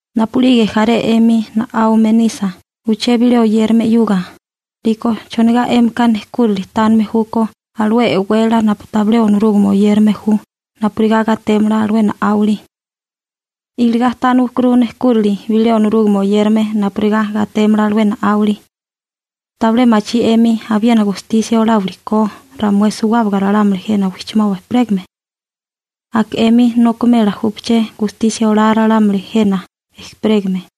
Napu'lige jaré 'emi na'áwame nisa uché bilé oyérame 'yuga, 'liko ¿chonigá 'émika nejkúrili tánime júkó alué e'wélala napu tabilé Onorúgame oyérame ju napurigá gatémala alué na'áwali? Iligá tániwakuru nejkúrili bilé Onorúgame oyérame napurigá gatémala alué na'áwali. ¿Tabilé machí 'emi abiena gatélime ko ramué suwábaga ralámuli jena wijchimoba ejperégame? Aka 'emi nokimela júpaché ra'íchali gatea ralámuli jena ejperégame 'yuga.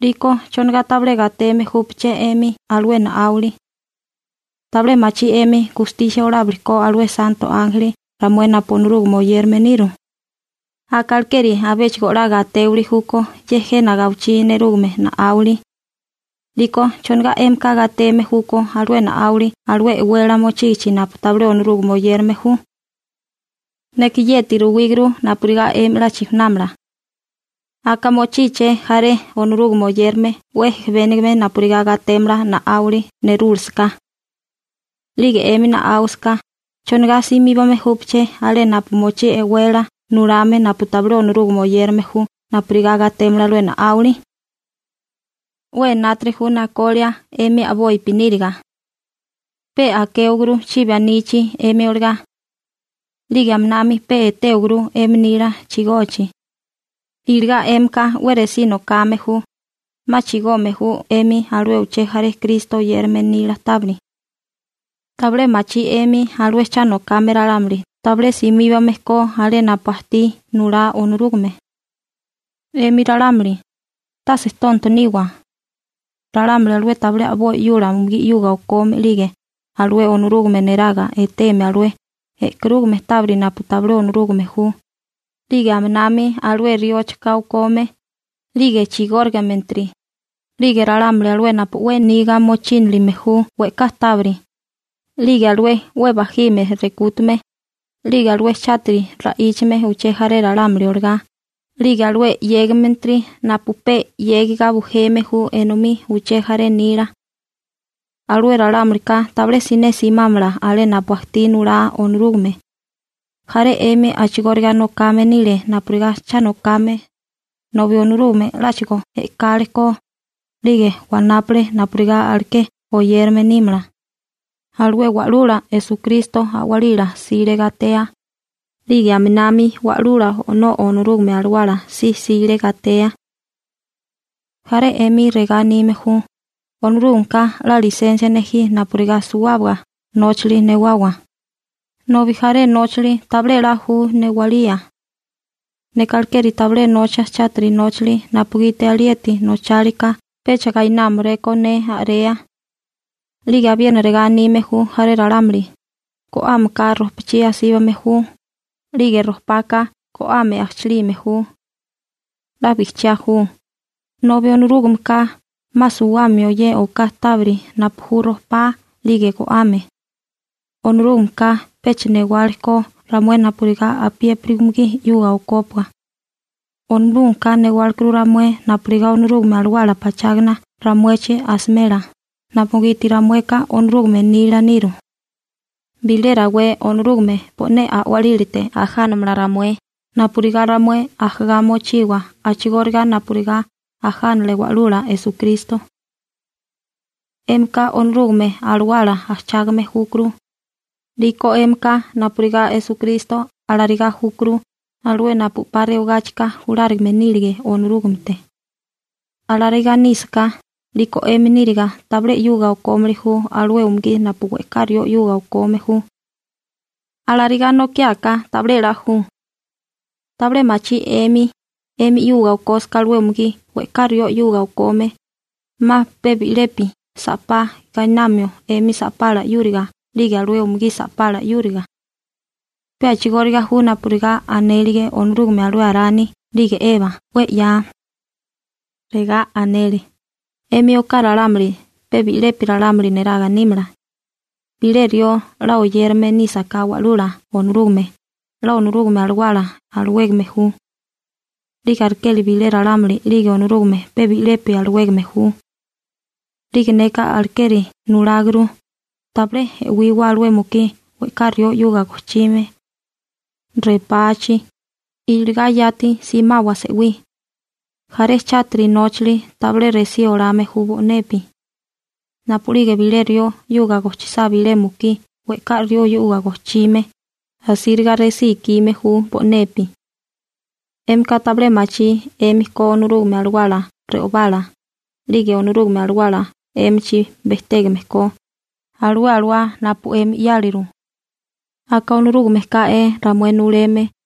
'Liko ¿chonigá tabilé gateme júpaché 'emi alué na'áwili? ¿Tabilé machí 'emi gatémili ko alué santo ánjeli 'yuga ramué napu Onorúgame oyérame niru? ¡Aka alekeri abéchigo 'la gatéwili júkó ye jena gawichí nerúgame na'áwili! 'Liko ¿chonigá 'émika gateme júkó alué na'áwili alué e'wélala mochígichi napu tabilé Onorúgame oyérame ju? Neka yeti ruwíguru napurigá 'emi 'la chijunámala. Aka mochíché jaré Onorúgame oyérame 'we ejebénigame napurigá gatémala na'áwili nerúlasaká. 'Lige 'émi na'áwasaká, ¿chonigá simíbame júpaché alé napu mochí e'wélala nulame napu tabilé Onorúgame oyérame ju napurigá gatémala alué na'áwali? 'We enátiri ju nakolia 'emi a'bopi níriga. Pe a'kéwaguru chibi anichi 'emi olagá. 'Lige aminami pe etéwaguru 'emi nila chigochi. Iligá 'émika 'we resí nokame ju, 'ma chigome ju 'emi alué uché jaré Kristo oyérame nila tábiri. ¿Tabilé machí 'emi alué cha nokame ralámuli tabilé simíbame ko alé napu ajtí nulá Onorúgame? 'Emi ralámuli, tase tonto niwa. Ralámuli alué tabilé a'boi 'yula umugí 'yuga o'kome 'lige alué Onorúgame neraga eteme alué e'karúgame tábiri napu tabilé Onorúgame ju, 'lige aminami alué rióchoká okome, 'lige chigórigametiri, 'lige ralámuli alué napu 'we niga mochínilime ju we'ká tábiri, 'lige alué 'we bajime rekútame, 'lige alué chátiri ra'íchame uché jaré ralámuli olagá, 'lige alué 'yégametiri napu pe 'yégiga bujeme ju enomí uché jaré nila. Alué ralámulika tabilé siné simámala alé napu ajtí nulá Onorúgame. Jaré 'emi a'chigóriga nokame nile napurigá cha nokame, nobi Onorúgame 'láchigo e'kálekó, 'lige wanápale napurigá aleké oyérame nímala. Alué Wa'lula Esukristo a'walila 'sile gatea, 'lige aminami Wa'lula O'nó Onorúgame Alawala si 'sile gatea. Jaré 'emi regá anime ju: «Onorúgameka 'la lisensia nejí napurigá suwábaga nóchali newawa», nobi jaré nóchali tabilé 'la ju newalía. Neka alekeri tabilé nocha chátiri nóchali napugiti alieti nóchalika pecha gainámaréko ne a'rea. 'Lige abiena regá anime ju jaré ralámuli: «Go'ámeka ropachí asíbame ju, 'lige ropaka go'ame ajchilime ju.» 'La bijchiá ju, nobi Onorúgameka 'ma suwamio ye oká tábiri napu ju ropá 'lige go'ame. Onorúgameka pecha newale ko ramué napurigá apiépiri umugí 'yuga okópua. Onorúgameka newálekuru ramué napurigá Onorúgame Alawala pachágana ramuechi asimela, napugiti ramueka Onorúgame nila niru. Bilé rawé Onorúgame bo'né a'walílate ajánamala ramué napurigá ramué ajagá mochiwa a'chigóriga napurigá ajánale Wa'lula Esukristo. 'Émika Onorúgame Alawala ajchágame júkuru, 'liko 'émika napurigá Esukristo alarigá júkuru alué napu 'pa rewagáchika julárigame nílige Onorúgamete. Alarigá nísaká, 'liko 'emi níriga tabilé 'yuga o'kómili ju alué umugí napu we'ká rió 'yuga o'kome ju. ¡Alanokiáká tabilé 'la ju! ¿Tabilé machí 'emi, 'emi 'yuga o'kósaká alué umugí we'ká rió 'yuga o'kome, 'ma pe bi'lepi sa'pá gainamio 'emi sa'pala 'yúriga 'lige alué umugí sa'pala 'yúriga? Pe a'chigóriga ju napurigá anélige Onorúgame alué Arani 'lige Eba 'we 'ya. Regá anele: «'Emi oká ralámuli pe bi'lepi ralámuli neraga nímala.» Bilé rió 'la oyérame nísaká Wa'lula Onorúgame 'la Onorúgame Alawala alawégame ju. 'Lige alekeri bilé ralámuli 'lige Onorúgame pe bi'lepi alawégame ju. 'Lige neka alekeri nuláguru: ¡Tabilé e'wiwa alué mukí we'ká rió 'yuga gojchime repachi! ¡Iligá yati simawa se'wí! Jaré chátiri nóchali tabilé resí olame ju bo'nepi. Napu'lige bilé rió 'yuga gojchisá bilé mukí we'ká rió 'yuga gojchime, asíriga resí ikime ju bo'nepi. ¿'Émika tabilé machí 'emi ko Onorúgame Alawala re'obala, 'lige Onorúgame Alawala 'émichi bejtégame ko, alué alawá napu 'emi 'yáliru? Aka Onorúgame ká'é ramué nuleme.